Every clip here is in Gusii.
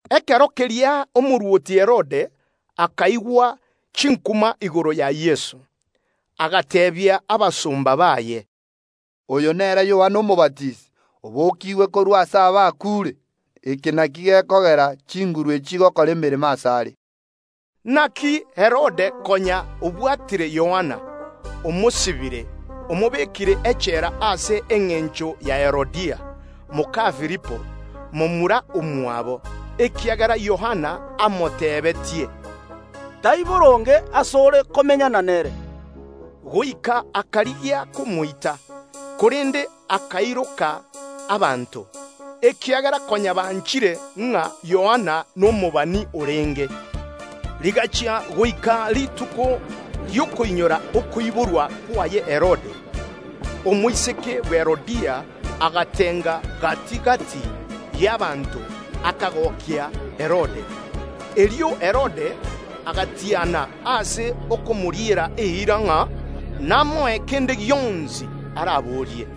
Ekero keria Herode omorwoti o Galili akaigwa chinkuma igoro ya Yeso; agateebia abasomba baye, “Oyo nere Yohana Omobatisi, obokiigwe korwa ase abakuure, eke nakio gekogera chinguru echio chigokora emeremo asare.” Inaki Herode konya obwatire Yohana, omosibire, omobekire echela ase engencho ya Herodia, moka Filipo, momura omwabo, ekiagera Yohana amotebetie, “Teri boronge ase ore komenyana nere.” Goika akarigia komoita, korende akairoka abanto, ekiagera konya banchire ng’a Yohana n’omobani orenge. Rigachia goika rituko ri’okoinyora okoiborwa kwaye Herode, omoiseke bwe Herodia agatenga gati‐gati y’ abanto, akagokia Herode. Erio Herode agatiana ase okomoriera eira ng’a namoe kende gionsi araborie.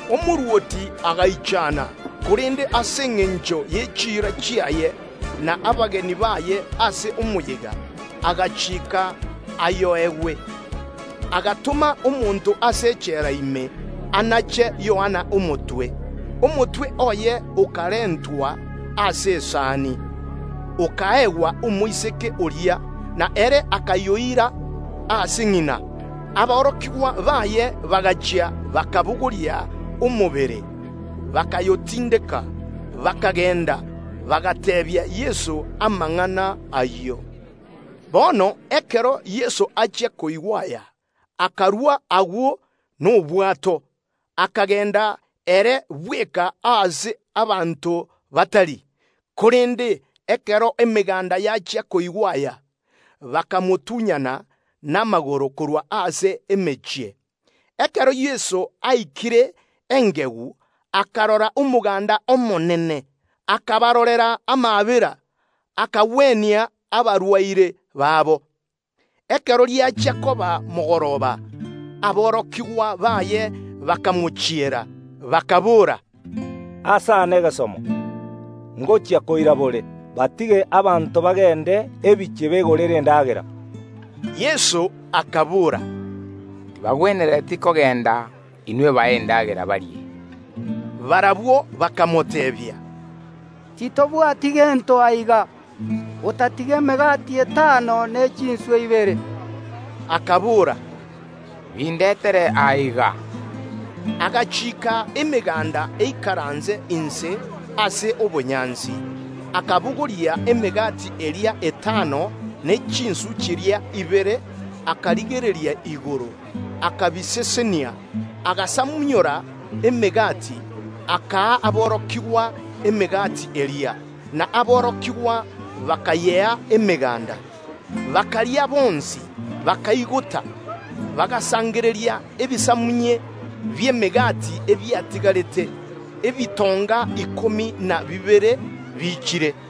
Omorwoti agaichana, korende ase engencho ye chiira chiaye na abageni baye ase omoyega, agachiika ayoegwe. Agatoma omonto ase echela ime anache Yohana omotwe. Omotwe oye okarentwa ase esani, okaegwa omoiseke oria, na ere akayoira ase ng’ina. Aborokigwa baye bagachia bakabogoria omobere, bakayotindeka, bakagenda, bagateebia Yeso amang’ana ayio. Bono ekero Yeso achia koigwa aya, akarua agwo nobwato, akagenda ere bweka aase abanto batari. Korende ekero emeganda yachia koigwa aya, bakamotunyana namagoro korwa ase emechie. Ekero Yeso aikire engegu, akarora omoganda omonene, akabarorera amaabera, akagwenia abarwaire babo. Ekero riachia koba mogoroba, aborokigwa baye bakamochiera, bakaboora, “Aase aa negesomo, ngochia koira bore, batige abanto bagende ebinyoro begorere endagera.” Yeso akabora, “Tibagwenereti kogenda; inwe bae endagera barie.” Barabwo bakamoteebia, “Titobwati gento aiga, otatiga emegati etano ne chinswe ibere.” Akabora, “Bindetere aiga.” Agachiika emeganda eikaranse inse ase obonyansi; akabogoria emegati eria etano ne chinswe chiria ibere, akarigereria igoro, akabisesenia, agasamunyora emegati, akaa aborokigwa emegati eria, na aborokigwa bakayea emeganda. Bakaria bonsi, bakaigota. Bagasangereria ebisamunye bi’emegati ebiatigarete, ebitonga ikomi na bibere biichire.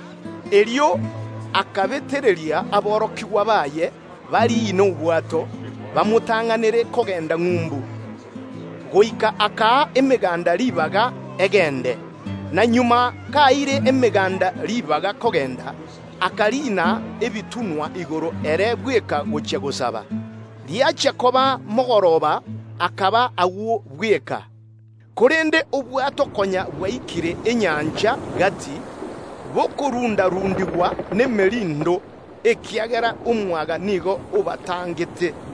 Erio agachiika aborokigwa baye bariine obwato, bamotang’anere kogenda ng’umbu ende, goika akaa emeganda ribaga egende. Na nyuma kaeire emeganda ribaga kogenda, akariina ebitunwa igoro ere bweka gochia gosaba. Riachia koba mogoroba akaba agwo bweka. Korende obwato konya bwaikire enyancha gati bokorunda‐rundigwa nemerindo, ekiagera omwaga nigo obatangete.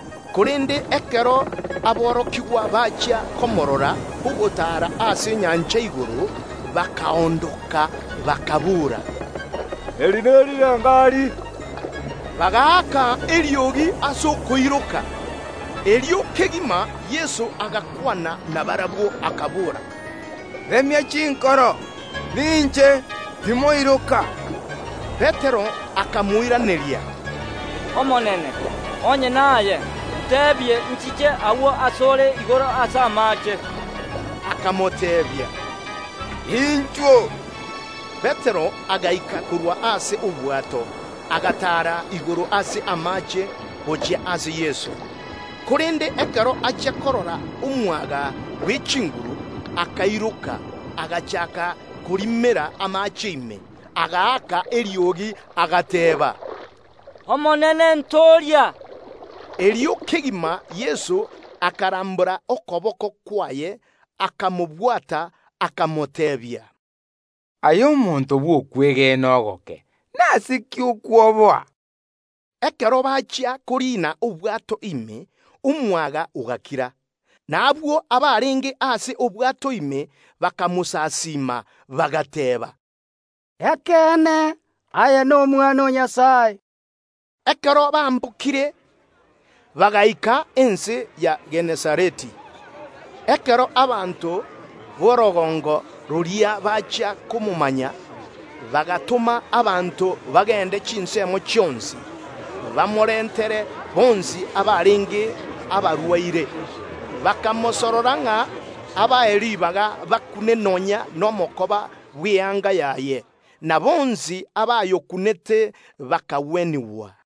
Korende ekero aborokigwa bachia komorora ogotaara ase enyancha igoro, bakaondoka, bakaboora, “Eri nerirengari!” Bagaaka eriogi ase okoiroka. Erio kegima Yeso agakwana nabarabwo, akabora, “Remia chinkoro! Ninche. Timoiroka!” Petero akamoiraneria, “Omonene, onye naye, ’nchiike nchiche agwo ase ore igoro ase amaache.” Akamoteebia, “Inchuo!” Petero agaika korwa ase obwato, agataara igoro ase amaache, gochia ase Yeso. Korende ekero achia korora omwaga bw’echinguru, akairoka, agachaaka korimera amaache ime, agaaka eriogi, agateeba, “Omonene ntooria!” Erio kegima Yeso akarambora okoboko kwaye, akamobwata akamoteebia, “Aye omonto bw’okwegena ogoke, nase ki okwoboa?” Ekero bachia koriina obwato ime, omwaga ogakira. N’abwo abarenge ase obwato ime bakamosasiima, bagateeba, “Ekeene, aye n’Omwana o Nyasae.” Ekero bambokire, bagaika ense ya Genesareti. Ekero abanto b’orogongo roria bachia komomanya, bagatoma amang’ana ase chinsemo chionsi, bamorentere bonsi abarenge abarwaire; bakamosorora ng’a abae ribaga bakune nonya nomokoba bw’eyanga yaye; na bonsi abayokunete bakagwenigwa.